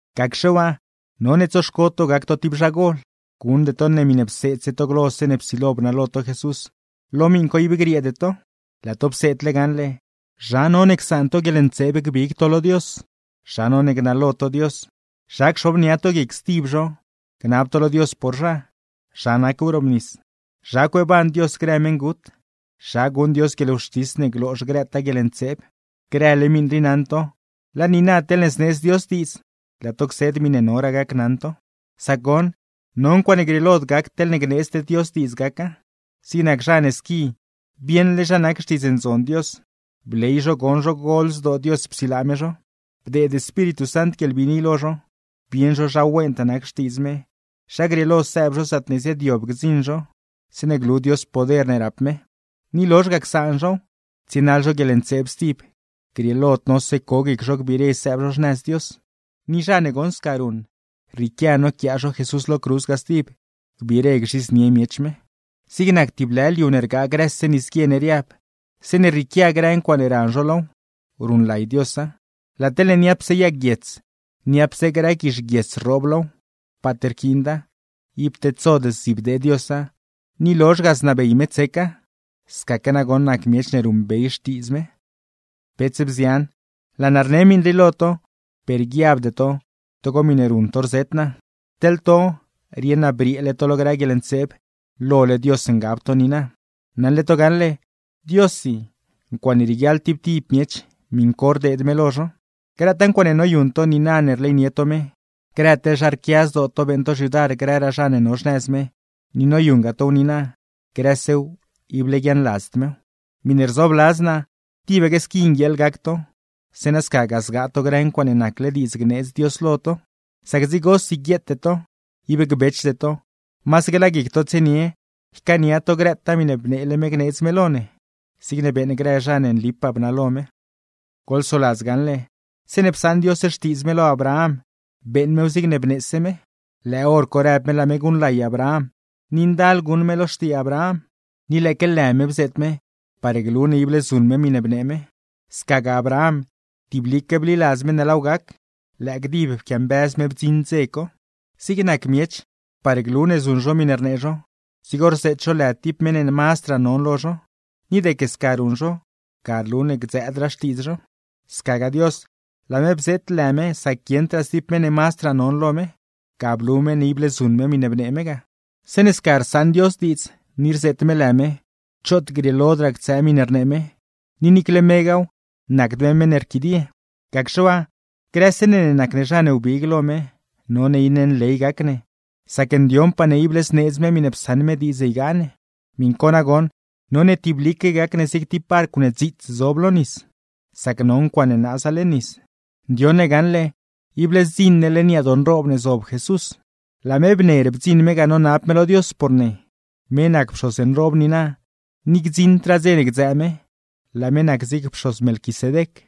Gacxe waa, none tsoxco to gac to tib zha gol. Guṉde to ne miṉe pseedse to glo zeeṉe psilo bnalo to Jesús, lo miṉ co ib grieede to. Laa to pseedle gaṉle: zha none csaan to guieḻntseeb gbig to lo Dios, zha none gnalo to Dios, zha cxobnia to guic stib zho, gnab to lo Dios por zha, zha nac wrobnis, zha cueeban Dios grë meṉgut, zha guṉ Dios guieḻwxtis ne gloozh grëtaa guieḻntseeb. Grële miṉ rii naṉ to. Laa niina teḻne zneedz Dios diidz, laa to cseed miṉe noraa gacnaṉ to. Sac goṉ, no ncuaaṉe grieelod gac teḻne gneedzd Dios diidz gaca. Zig nac zha ne squi bieṉle zha nac Xtiidz Ndzon Dios, bley zho goṉ zho gol zdoo Dios psilaa me zho, bdeed Espíritu Sant guieḻbiini lo zho, bieṉ zho zha wentaa nac xtiidz me, zha grieelo sëëb zho zaatne ziaadyob gdziṉ zho (zeeṉe glu Dios grë poder ne rap me), ni lozh ga csaan zhow, tsienaḻ zho guieḻntseeb stib; grieelod nose co guic zho gbiire sëëb zho xnëz Dios. Ni zha ne goṉ sca ruṉ, rrieequia noquiaa zho Jesús lo cruz ga stib, gbiire gzhidznie miech me. Zig nac tib lë liu ne rgaa grëse nisguie ne riab, zeeṉe rrieequia grë ncuaaṉe ran zho low, ruṉlay Diosa; laa teḻne niapse yag guiets, niapse grë guizh guiets rroob low, paat rquiinda; ib tedsod zdzibdee Diosa, ni lozh ga znabey me tseca. Scaque nagoṉ nac miech ne ruṉbey Xtiidz me. Bets, bzian, laa naa rne miṉ rii lo to, per guiabde to togo miṉe ruṉ to rzet naa. Teḻ to, rieṉ naa brieele to lo grë guieḻntseeb, lole Dios ngab to niina. Naṉle to gaṉle, Diossi ncuaaṉe rieguiaḻ tib tib miech, miṉ co rdeed me lo zho. Grëtaa ncuaaṉe noyuṉ to niina ne rleynie to me, grë teḻ zha rquia zdoo to beeṉ to xyudar grëraa zha ne no xnëz me, ni noyuṉgaa tow niina; grësew ible guiaaṉladzd mew. Miṉe rzoobladz naa, tibaque squi nguieeḻ gac to, zeeṉa scagaa zgaa to grë ncuaaṉe nacle diidz gneedz Dios lo to. Sac dzigosi guieete to, ib gbechde to; masaque laa guic to tsienie ycaania to grëtaa miṉe bneele me gneedz me lo ne; zigne beeṉ grë zha ne nlipaa bnalo me. Goḻsoladz gaṉle, zeeṉe psaṉ Dios xtiidz me lo Abraham beeṉ mew zigne bneese mew. Lëë hor co rëb me laa me guṉlay Abraham, ni ndal guṉ me lo xtii Abraham. Ni lëëque lë me bzeet me, par glu ne ible zuṉ me miṉe bnee me. Scagaa Abraham, tiblique bliladz me ne laaw gac; lëë gdib pquiambëz me bdziṉ dze co. Zig nac miech, par glu ne zuṉ zho miṉe rnee zho, dzigo rzeet zho lë tib meṉ ne mazdraa non lo zho; ni deque sca ruṉ zho ga rlu ne gdzëëdraa xtiidz zho. Scagaa Dios, laa me bzeet lë me sac guieṉdraa stib meṉ ne mazdraa non lo me. Ga blu me ne ible zuṉ me miṉe bnee me ga. Zeeṉe sca rsaṉ Dios diidz, ni rzeet me lë me, choot grieelodraa ctsëë miṉe rnee me, ni niicle megaaw nacd me meṉ ne rquidie. Gacxe waa, grëse ne ne nac ne zha ne wbig lo me, none iṉe nley gac ne, sac ndioṉpaa ne ne ible zneedz me miṉe psaṉ me diidz ygaa ne. Miṉ co nagoṉ, none tiblique gac ne zig tib barcw ne dziits zob lo nis, sac no ncuaaṉe naaza leṉ nis; ndioṉ ne gaṉle, ible zdziṉ ne leṉ yadoo nroob ne zob Jesús. Laa me bner bdziṉ me ga nonab me lo Dios por ne. Me nac pxoz nroob niina, ni gdziṉdraa dze ne gdzëë me; laa me nac zig goc pxoz Melquisedec.